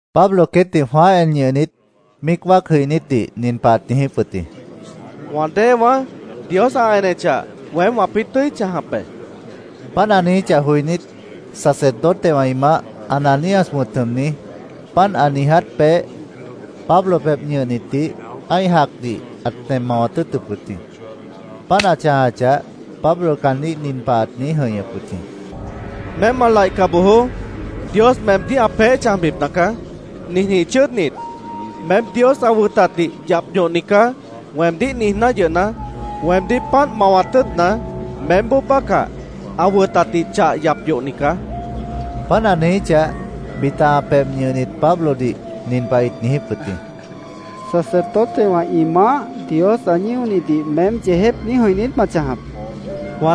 Pablo queétdih jwãáh en ñʉhnit, míic wáac jʉinítdih nin pah ãt niijíp wʉt jĩ: —Wã déewãá, Dios ã enechah, weém wãpĩ́ tʉ́i chãjap be, ãt niijíp wʉt jĩ. Páant ã niijíchah joinít, sacerdotewã ĩ maáh, Ananías wʉ̃t jʉmni, páant ã niiját peéh, Pablo pebh ñʉhnitdih ã́ih jacdih ãt nem mawat tʉ́ʉtʉp wʉt jĩ. Páant ã chãjachah, Pablo caandíh nin pah ãt niíj jʉ̃ihñʉp wʉt jĩ: —Meém ma laihca bojoó. Dios meemdíh ã peéh chãjbipna caá. Ninjĩh chʉ́ʉdnit, ‘Meém Dios ã wʉtatdih yap yohni caá’, weemdíh niijná yʉhna, weemdíh páant mawat tʉ́ʉtna, meémboó bácah ã wʉtatdih chah yap yohni caá, ãt niijíp wʉt jĩ. Páant ã niijíchah, bita ã pebh ñʉhnit Pablodih nin pah ĩt niijíp wʉt jĩ: —¿Sacerdotewã ĩ maáh Dios ã ñíonidih meém yeejép niíj jʉ̃ih niít ma chãjap? ĩt niijíp wʉt jĩ.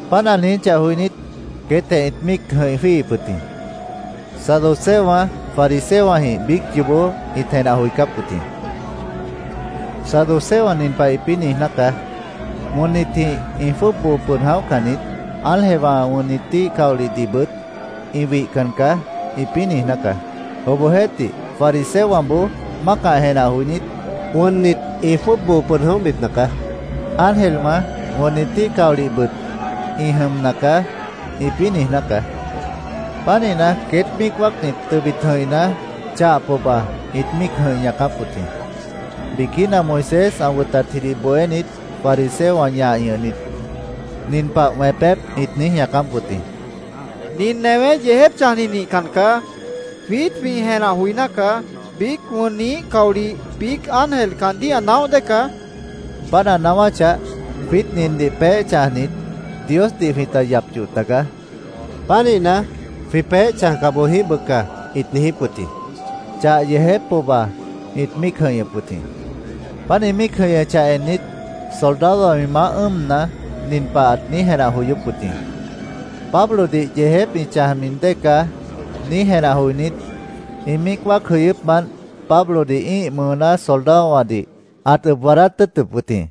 Páant ã niijíchah joinít, queétjeh ĩt míic jʉ̃ih jwíihip wʉt jĩ. Saduceowã fariseowãjĩh biíc yoobó ĩt jenah joicáp wʉt jĩ. Saduceowã nin pah ĩpĩ́ niijná caá: “Wʉnnitji ĩ jwʉ́ʉb boo pʉd jʉ̃óhcan niít. Ángelwã, wʉnnitíh caolihnabʉt ĩ wihcan caá”, ĩpĩ́ niijná caá. Obohjeéhtih, fariseowãboó mácah jenah joinít, “Wʉnnit ĩ jwʉ́ʉb boo pʉd jʉ̃óhbipna caá. Ángelwã, wʉnnitíh caolihnabʉt ĩ jʉmna caá”, ĩpĩ́ niijná caá. Pánihna, queét míic wáacnit tʉbit jʉ̃ihna, chah pohba ĩt míic jʉ̃ih ñaacáp wʉt jĩ. Biquína Moisés ã wʉtatjidih bohénit fariseowã ñah ñʉhnit, nin pah wẽpép ĩt niíj ñaacáp wʉt jĩ: —‘Nin newé yeejép chãjni nihcan caá’, jwiít jwĩ niíj jenah joiná caá. Biíc wʉnniíh caolih, biíc ángel caandíh ã naóh dée caá. Páant ã naáwáchah, jwiít nindih peéh chãjnit, Diosdih jwĩta yap yoh tagaá. Pánihna, jwĩ peéh chãjca boj jĩíh bʉca, ĩt niijíp wʉt jĩ. Chah yeejép pohba ĩt míic jʉ̃ihñʉp wʉt jĩ. Páant ĩ míic jʉ̃ihñʉchah ennit, soldadowã ĩ maáh ʉ́ʉmna, nin pah ãt niíj jenah joyóp wʉt jĩ: “Pablodih yeejép ĩ chãjmi dée caá”, niíj jenah joinít, ĩ míic wáac jʉyʉ́pmant Pablodih ĩ́ih mʉʉná soldadowãdih ãt ʉb waadáát tʉ́ʉtʉp wʉt jĩ.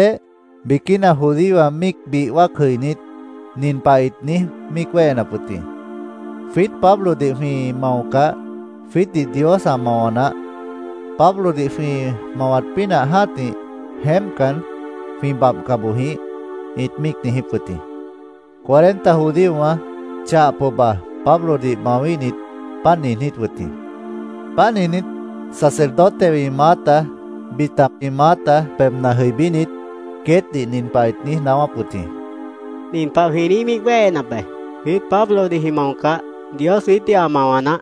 Cheibitjeh, biquína judíowã míic bih wáac jʉinít, nin pah ĩt niíj míic wéhenap wʉt jĩ: “Jwiít Pablodih jwĩ maocah, jwiítdih Dios ã mawa naáh. Pablodih jwĩ mawat pínah jã́tih, jeémpcan, jwĩ babhca boj jĩíh”, ĩt míic niijíp wʉt jĩ. Cuarenta judíowã chah pohba Pablodih mawíhnit páant niijnít wʉt jĩ. Páant niijnít, sacerdotewã ĩ maáta, bita ĩ maáta pebhna jʉibínit, queétdih nin pah ĩt niíj naáwáp wʉt jĩ: —Nin pah jwĩ niíj míic wéhenap be: ‘Jwiít Pablodih jwĩ maocah, Dios jwiítdih ã mawa naáh.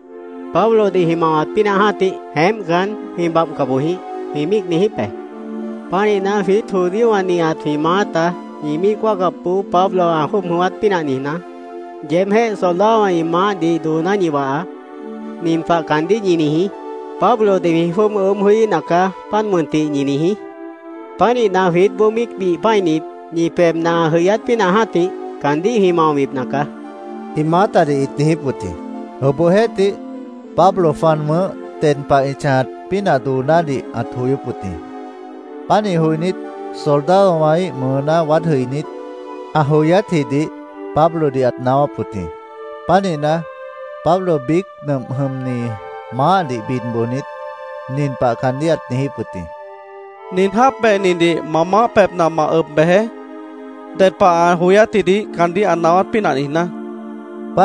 Pablodih jwĩ mawat pínah jã́tih, jeémpcan, jwĩ babhca boj jĩíh’, jwĩ míic niijíp be. Pánihna, jwiít judíowã nihat jwĩ maáta ñi míic wáacapboó Pablo ã jwʉ́ʉb jʉ̃ʉ́wát pínah niijná, yeebjéh soldadowã ĩ maáhdih dooná ñi wahaá. Nin pah caandíh ñi niijí. ‘Pablodih jwĩ jwʉ́ʉb ʉʉ́bh joííhna caá, páant mʉntih’, ñi niijí. Pánihna, jwiítboó míic bih pã́init, ñi pebhna ã jʉyát pínah jã́tih, caandíh jwĩ maobipna caá, ĩ maátadih ĩt niijíp wʉt jĩ. Obohjeéhtih, Pablo jwan wʉ̃ʉ́h ded pah ĩ chãjat pínah doonádih ãt joyóp wʉt jĩ. Pánih joinít, soldadowãíh mʉʉná waád jʉibínit, ã joyátjidih Pablodih ãt naáwáp wʉt jĩ. Pánihna, Pablo biíc nʉmp jʉmni maáhdih bid bojnit, nin pah caandíh ãt niijíp wʉt jĩ: —Nin jáap behnidih ma maáh pebhna ma ʉb bejeé, ded pah ã joyátjidih caandíh ã naáwát pínah niijná, ãt niijíp wʉt jĩ.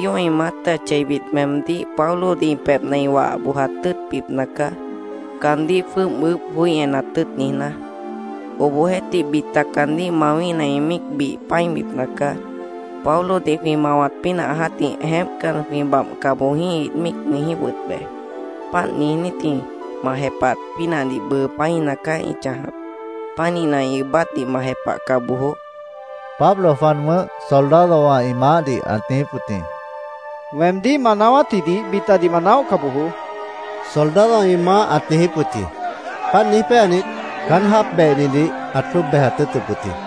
—Judíowã ĩ maáta cheibit meemdíh Pablodih ĩ pebhna ĩ wah bojat tʉ́ʉtbipna caá, caandíh jwʉ́ʉb ʉʉ́bh joí enat tʉ́ʉt niijná. Obohjeéhtih, bita caandíh mawíhna, ĩ míic bih pã́ibipna caá. ‘Pablodih jwĩ mawat pínah jã́tih, jeémpcan, jwĩ babhca boj jĩíh’, ĩt míic niijíp wʉt be. Páant niijnítji ma jepahat pínahdih bʉʉ pã́ina caá ĩ chãjap. Pánihna, ĩ ʉʉ́bátdih ma jepahca bojoó, Pablo jwan wʉ̃ʉ́h soldadowã ĩ maáhdih ãt niijíp wʉt jĩ. —Weemdíh ma naáwátjidih bitadih ma naóhca bojoó, soldadowã ĩ maáh ãt niijíp wʉt jĩ. Páant niíj péanit, caán jáap behnidih ãt jwʉ́ʉb bejat tʉ́ʉtʉp wʉt jĩ.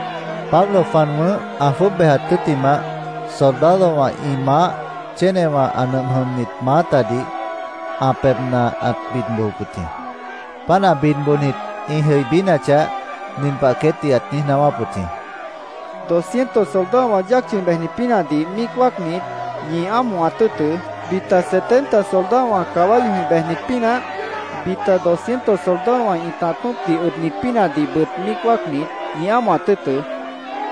Pablo jwan wʉ̃ʉ́h ã jwʉ́ʉb bejat tʉ́ttimah, soldadowã ĩ maáh chénewã ã nʉmp jʉmnit maátadih ã pebhna ãt bid bojop wʉt jĩ. Páant ã bid bojnit ĩ jʉibínachah, nin pah queétdih ãt niíj naáwáp wʉt jĩ: “Doscientos soldadowã yáac chʉ̃i bejnit pínahdih míic wáacnit, ñi ámohat tʉ́ʉtʉ́. Bita setenta soldadowã caballowãjĩh bejnit pínah, bita doscientos soldadowã ĩtah tṍopdih ʉbnit pínahdihbʉt míic wáacnit, ñi ámohat tʉ́ʉtʉ́.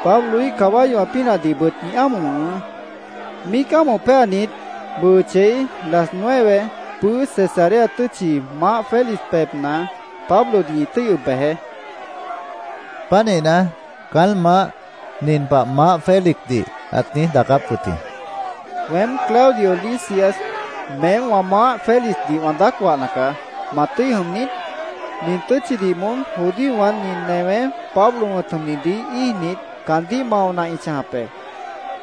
Pabloíh caballowã pínahdihbʉt ñi ámoh wʉ̃hʉʉ́. Míic ámoh péanit, bʉʉ chei las nueve, pʉ́ʉ́ Cesarea tʉ́tchi, Maáh Félix pebhna Pablodih ñi tʉ́i ʉb bejeé”, ãt niijíp wʉt jĩ. Pánihna, caán maáh nin pah Maáh Félixdih ãt niíj daacáp wʉt jĩ: “Weém, Claudio Lisias meém wã maáh Félixdih wã daác wahna caá. ¿Ma tʉ́i jʉm niít? Nin tʉ́tchidih moón judíowã nin newé Pablo wʉ̃t jʉmnidih íijnit, caandíh maona ĩ chãjap be.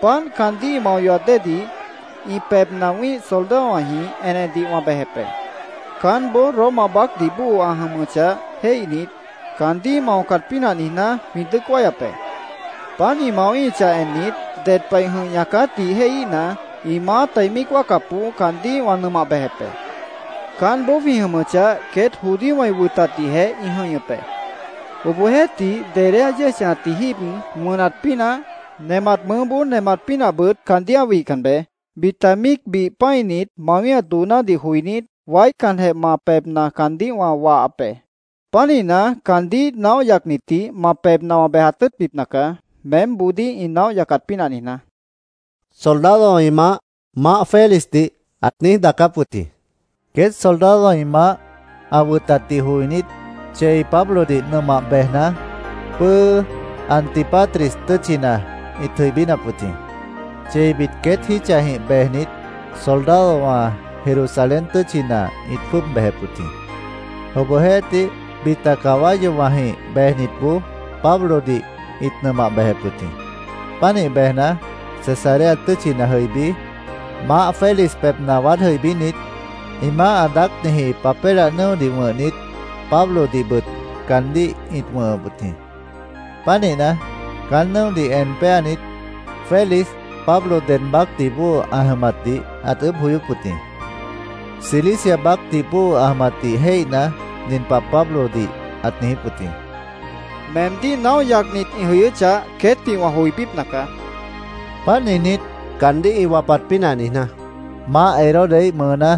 Páant caandíh ĩ mao yohat déedih, ĩ pebhna wĩ́ih soldadowãjĩh enedih wã bejep be. Caánboó Roma baácdih bóo ã jʉmʉchah jéihnit, caandíh ĩ maocat pínah niijná, jwĩ dʉ́ʉc wáyap be. Páant ĩ mawíhichah ennit, ded pah ĩ jʉ̃ih ñaacátdih jéihíhna, ĩ maáta ĩ míic wáacapboó caandíh wã nʉmah bejep be. Caánboó jwĩ jʉmʉchah, queét judíowã ĩ wʉtatdihjeh ĩ jʉ̃ihñʉp be. Obohjeéhtih, dedé ã yéej chãjatji jíib wʉnat pínah, nemat mʉʉ́boó nemat pínahbʉt caandíh ã wihcan beé. Bita míic bih pã́init mawíhat doonádih joinít, waícanjeh ma pebhna caandíh wã wahap be. Pánihna, caandíh naóh yacnitdih ma pebhna wã bejat tʉ́ʉtbipna caá, meémboodíh ĩ naóh yacat pínah niijná”, soldadowã ĩ maáh Maáh Félixdih ãt niíj daacáp wʉt jĩ. Queét soldadowã ĩ maáh ã wʉtatdih joinít, chei Pablodih nʉmah bejna, pʉ́ʉ́ Antípatris tʉ́tchina ĩt jʉibínap wʉt jĩ. Cheibit queét jítchajĩh bejnit soldadowã Jerusalén tʉ́tchina ĩt jwʉ́ʉb bejep wʉt jĩ. Obohjeéhtih, bita caballowãjĩh bejnitboó Pablodih ĩt nʉmah bejep wʉt jĩ. Pánih bejna, Cesarea tʉ́tchina jʉibí, Maáh Félix pebhna waád jʉibínit, ĩ maáh ã daácniji papélah nʉ́odih wʉ̃hnit, Pablodihbʉt caandíh ĩt wʉ̃hʉp wʉt jĩ. Pánihna, caán nʉ́odih en péanit, Félix Pablo ded baácdih bóo ã jʉmatdih ãt ʉʉ́bh joyóp wʉt jĩ. Cilicia baácdih bóo ã jʉmatdih jéihna, nin pah Pablodih ãt niijíp wʉt jĩ: —Meemdíh naóh yacnit ĩ jʉyʉ́chah, queétdih wã joibípna caá, ãt niijíp wʉt jĩ. Páant niijnít, caandíh ĩ wapat pínah niijná, Maáh Herodesjiíh mʉʉná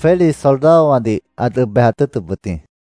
Félix soldadowãdih ãt ʉb bejat tʉ́ʉtʉp wʉt jĩ.